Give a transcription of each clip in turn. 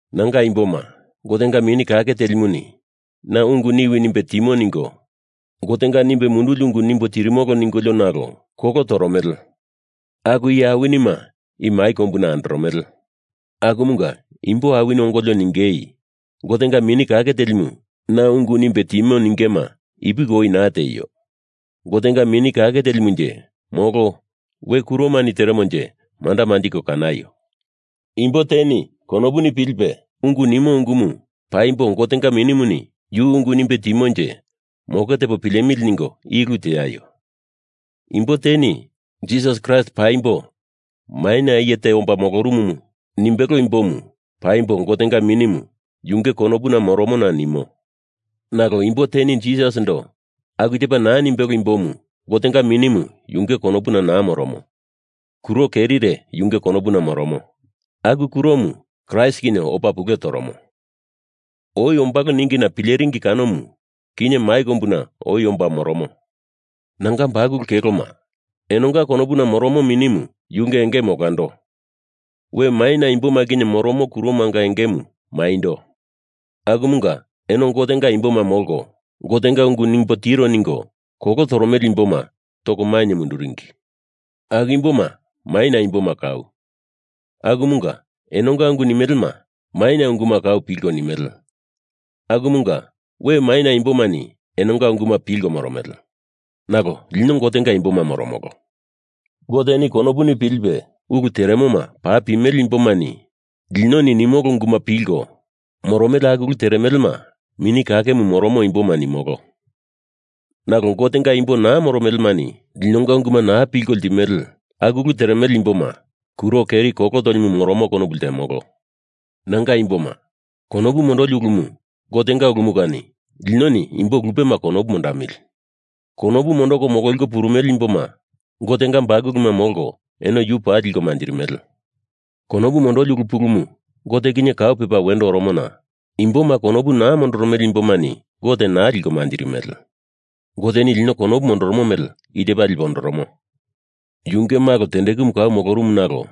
Nanga imboma, Gotenga Mini Kake Telimuni na ungu niwi nimbe timo ningo Gotenga nimbe munduli ungu nimbo tirimolo ningolio nalo kolo toromele aku iye awinima i mai kombuna andoromele. Akumunga imbo awini ongolio ningei Gotenga Mini Kake Telimu na ungu nimbe timo ningema ipuki oi naa tieio. Gotenga Mini Kake Telimunje molo we kuromani teremonje manda manjiko kanaio. Imbo teni konopuni pilipe ungu nimo ungumu paimbo Gotenga Minimuni yu ungu nimbe timonje moke tepo pilemili ningo i ulu teaio. Imbo teni Jisas Kraist paimbo maina iye te omba molorumu nimbelo imbomu, paimbo Gotenga Minimu yunge konopuna moromona nimo. Nalo imbo teni Jisasindo aku tepa naa nimbelo imbomu Gotenga Minimu yunge konopuna naa moromo, kuro kerire yunge konopuna moromo. Aku kuromu Kraist kinye opa pule toromo. Oi ombalo ningina pileringi kanomu kinye mai kombuna oi omba moromo. Nanga bakulu keloma, enonga konopuna moromo Minimu yunge engemu olando, we maina imboma kinye moromo kuromanga engemu maindo, akumunga eno Gotenga imboma molko, Gotenga ungu nimbo tiro ningo kolo toromele imboma toko mainye munduringi. Aku imboma maina imboma kau, akumunga enonga ungu nimelema maina unguma kau pilko nimele, akumunga we maina imbomani enonga unguma pilko moromele. Nalo lino Gotenga imboma moromolo. Goteni konopuni pilipe ulu teremoma paa pimele imbomani linoni nimolo unguma pilko moromele aku ulu teremelema, Mini Kakemu moromo imboma nimolo. Nalo Gotenga imbo naa moromelemani linonga unguma naa pilko ltimele aku ulu teremele imboma kuro keri kolo tolimu moromo konopu ltemolo. Nanga imboma, konopu mondoli ulumu Gotenga ulumu kani linoni imbo lupema konopu mondamili! Konopu mondoko mololiko purumele imboma Gotenga bakuluma molko eno yu paa liko manjirimele. Konopu mondoli ulu pulumu Gote kinye kau pepa wendo oromona imboma konopu naa mondoromele imbomani Gote naa liko manjirimele. Goteni lino konopu mondoromo mele i tepa lipe ondoromo: Yunge malo tendekumu kau molorumu, nalo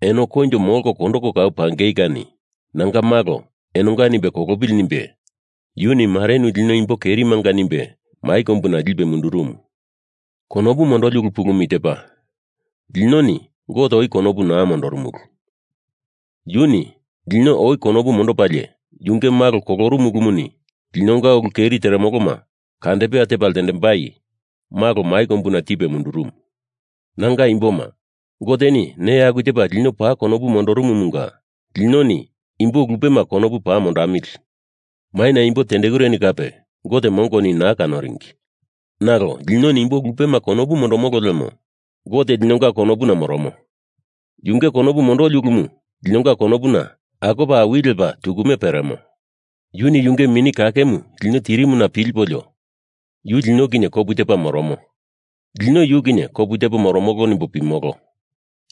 eno koinjo molko kondoko kau pangei kani nanga malo enonga nimbe kolopili nimbe yuni marenu lino imbo kerimanga nimbe mai kombuna lipe mundurumu. Konopu mondoli ulu pulumu i tepa: Linoni Gote oi konopu naa mondorumulu. Yuni lino oi konopu mondopalie yunge malo kolorumu ulumuni linonga ulu keri teremoloma kandepea tepa ltendembai malo mai kombuna tipe mundurumu. Nanga imboma, Goteni neya aku tepa lino paa konopu mondorumumunga linoni imbo lupema konopu paa mondamili. Maina imbo tendekureni kape Gote mongoni naa kanoringi. Nalo linoni imbo lupema konopu mondomolo lemo Gote linonga konopuna moromo, yunge konopu mondoli ulumu linonga konopuna akopa awili lepa tukume peremo. Yuni yunge Mini Kakemu lino tirimuna pilipolio Yu lino kinye kopu tepa moromo, lino yu kinye kopu tepo moromolo nimbo pimolo.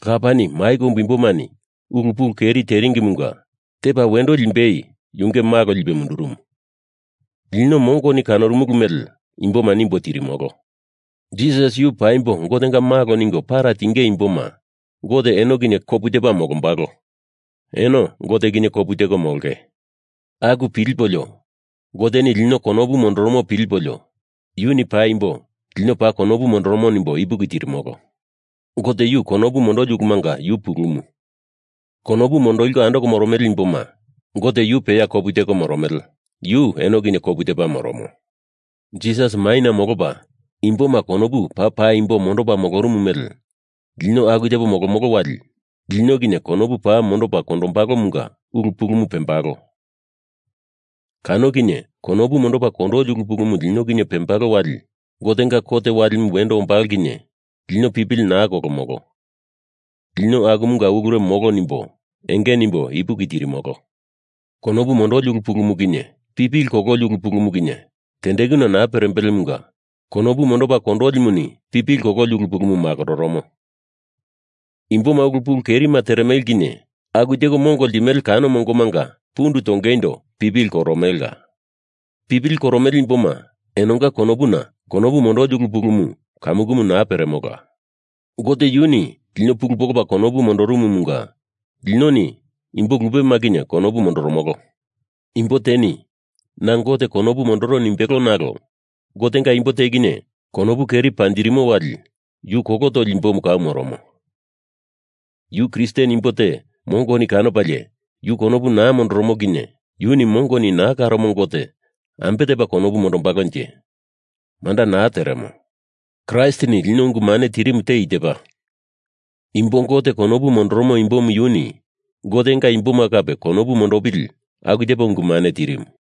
Lapani mai kombu imbomani ulu pulu keri teremelemunga tepa wendo limbei yunge malo lipe mundurumu, lino mongoni kanorumulu mele imboma nimbo tirimolo. Jisas yu paimbo Gotenga Malo ningo para tinge imboma Gote eno kinye kopu tepa molombalo, eno Gote kinye kopu teko molonge. Aku pilipolio Goteni lino konopu mondoromo pilipolio Yuni paimbo lino paa konopu mondoromo nimbo ipuki tirimolo. Gote yu konopu mondoli ulumunga yu pulumu. Konopu mondoliko andoko moromele imboma Gote yu peya kopu teko moromele, yu eno kinye kopu tepa moromo. Jisas maina molopa imboma konopu paa paimbo mondopa molorumu mele lino aku tepo molomolo wali lino kinye konopu paa mondopa kondolimunga ulu pulumu pembalo. Kano kinye konopu mondopa kondoli ulu pulumu lino kinye pembalo wali Gotenga kot walimu wendo ombalo kinye lino pipili naa kolomolo, lino akumunga ulure molo nimbo enge nimbo ipuki tirimolo. Konopu mondoli ulu pulumu kinye pipili kololi ulu pulumu kinye tendekuna naa perembelemunga konopu mondopa kondolimuni pipili kololi ulu pulumu makororomo. Imboma ulu pulu kerima teremele kinye aku teko mongo ltimele kano mongomanga pundu tongeindo pipili koromelela. Pipili koromele imboma enonga konopuna konopu mondoli ulu pulumu kamukumu naa peremola. Gote yuni lino pulu polopa konopu mondorumumunga linoni imbo lupema kinye konopu mondoromolo. Imbo teni, na Gote konopu mondoro nimbelo nalo Gotenga imbo te kinye konopu keri panjirimo wali yu kolo toli imbomu kau moromo. Yu Kristen imbo te mongoni kanopalie yu konopu naa mondoromo kinye yuni mongoni naa kanoromo Gote ambe tepa konopu mondombalonje? Manda naa teremo. Kraistini lino ungu mane tirimu te i tepa: imbo Gote konopu mondoromo imbomu yuni Gotenga imboma kape konopu mondopili aku tepa ungu mane tirimu.